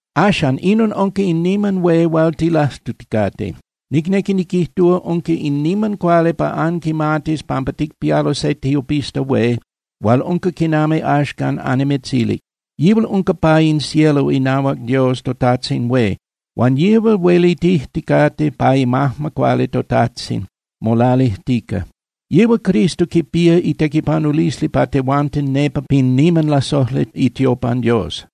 Axan, inon unca in niman hué hual tilajtuticate, nicnequi niquijtúa, unca in niman cuali pa anquimatis pampa ticpialo se tiopista hué hual unca quinami axcan annimitzilic. Yihual unca pa in cielo inahuac Dios toTajtzin Hué. Huan yihual huelitijticate, pa imajma cuali toTajtzin molalijtica. Yihual Cristo quipía itequipanulisli pa tehuanten nepa pin niman lasojli itiopan Dios.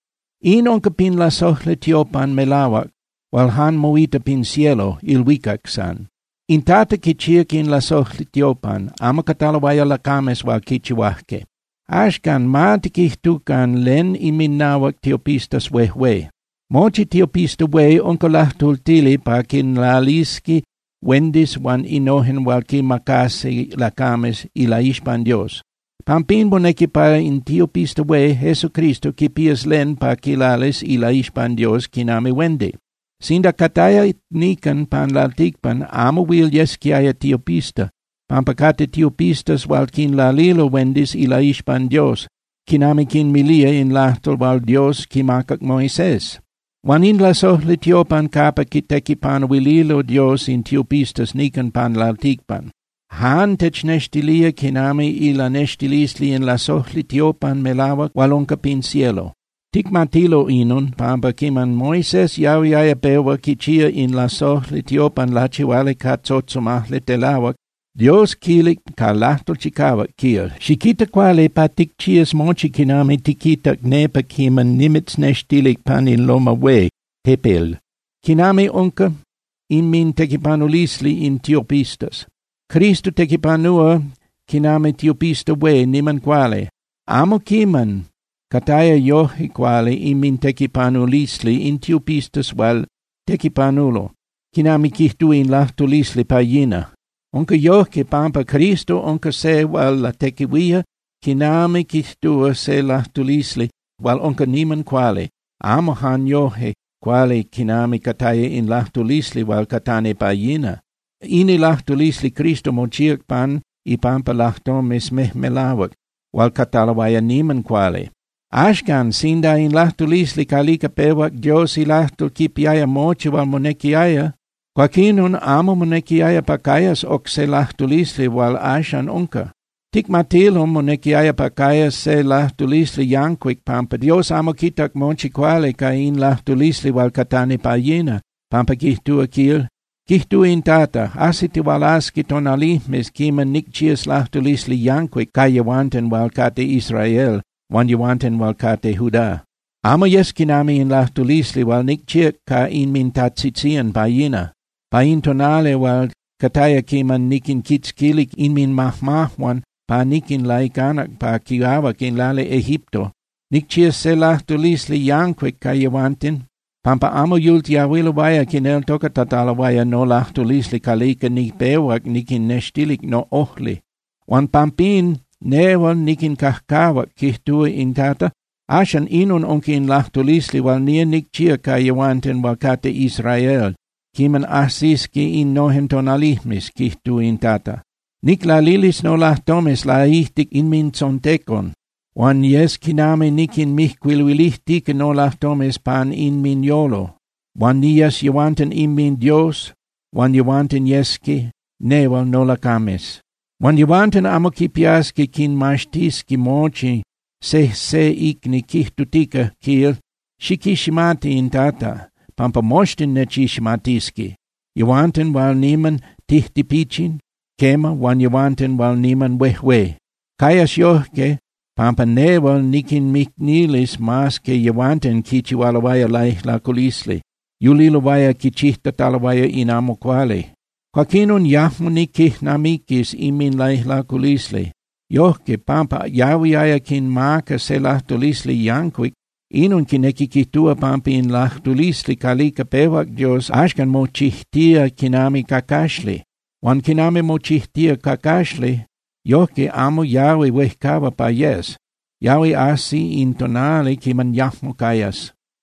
In unca pin lasojli tiopan melahuac hual jan moita pin cielo (ilhuicac) san. In Tata quichíac in lasojli tiopan, amo cataloaya lacames hual quichihuajque. Axcan, ma tiquijtucan len inminahuac tiopistas huejué. Mochi tiopista hué unca lajtultili pa quinlalisqui huendis huan innojen hual quimacasqui lacames ilaixpan Dios. Pampín, monequi pa in tiopista hué, Jesucristo, quipías len pa quilalis ilaixpan Dios quinami huendi. Sinda cataya nican pan lalticpan, amo huil yesquiaya tiopista, pampa cate tiopistas hual quinlalilo huendis ilaixpan Dios, quinami quinmilía in lajtol hual Dios quimacac Moisés. Huan in lasojli tiopan capa quitequipanuililo Dios in tiopistas nican pan lalticpan jan technextilía quinami ilanextilisli in lasojli tiopan melahuac hual unca pin cielo. Ticmatilo inon, pampa quiman Moisés yahuiaya pehua quichía in lasojli tiopan lachihuali ca tzotzomajli telahuac, Dios quilic ca lajtol chicahuac, quil: “Xiquita cuali pa ticchías mochi quinami tiquitac nepa quiman nimitznextilic pan in loma hué (tepel).” Quinami unca inmintequipanulisli in tiopistas, Cristo tequipanúa quinami tiopista hué niman cuali. Amo quiman cataya yoje cuali inmintequipanulisli in tiopistas hual tequipanulo quinami quijtúa in lajtulisli pa yina. Unca yojque pampa Cristo unca se hual latequihuía quinami quijtúa se lajtulisli hual unca niman cuali, amo jan yoje cuali quinami cataya in lajtulisli hual catani pa yina. In ilajtulisli Cristo mochíac pan ipampa lajtomes mejmelahuac hual cataloaya niman cuali. Axcan, sinda in lajtulisli calica pehuac Dios ilajtol quipiaya mochi hual monequiaya, cuaquinon amo monequiaya pa cayas oc se lajtulisli hual axan unca. Ticmatilo monequiaya pa cayas se lajtulisli yancuic pampa Dios amo quitac mochi cuali ca in lajtulisli hual catani pa yina, pampa quijtúa, quil: Quijtúa in Tata: Ajsitihualasqui tonalijmes quiman nicchías lajtulisli yancuic ca yehuanten hual cate Israel huan yehuanten hual cate Judá. Amo yes quinami in lajtulisli hual nicchíac ca inmintajtzitzían pa yina, pa in tonali hual cataya quinami niquinquitzquilic inminmajmajuan pa niquinlaicanac pa quiahuac in lali Egipto. Nicchías se lajtulisli yancuic ca yehuanten pampa amo yultiahuiloaya quineltocatataloaya nolajtulisli calica nipehuac niquinnextilic noꞌojli. Huan pampín nehual niquincajcahuac, quijtúa in Tata. Axan inon unca in lajtulisli hual nía nicchía ca yehuanten hual cate Israel quiman ajsisqui innojen tonalijmes, quijtúa in Tata: Niclalilis nolajtomes laijtic inmintzontecon huan yes quinami niquinmijcuiluilijtica nolajtomes pan inminyolo, huan niyes yehuanten inminDios, huan yehuanten yesqui nehual nolacames. Huan yehuanten amo quipiasqui quinmaxtisqui mochi sejse icni, quijtutica, quil, xiquiximati in Tata, pampa moxtin nechiximatisqui, yehuanten hual niman tijtipichin, quema, huan yehuanten hual niman huejué. Cayas yojque pampa nehual niquinmicnilis mas que yehuanten quichihualoaya laijlaculisli, yuliloaya quichijtataloaya in amo cuali. Cuaquinon yajmo niquijnamiquis inminlaijlaculisli. Yojque, pampa yahuiaya quinmaca se lajtulisli yancuic, inon quinequi quijtúa pampa in lajtulisli calica pehuac Dios axcan mochijtía quinami cacaxli. Huan quinami mochijtía cacaxli, yojque amo yahui huejcahua pa yes, yahui ajsi in tonali quiman yajmo cayas.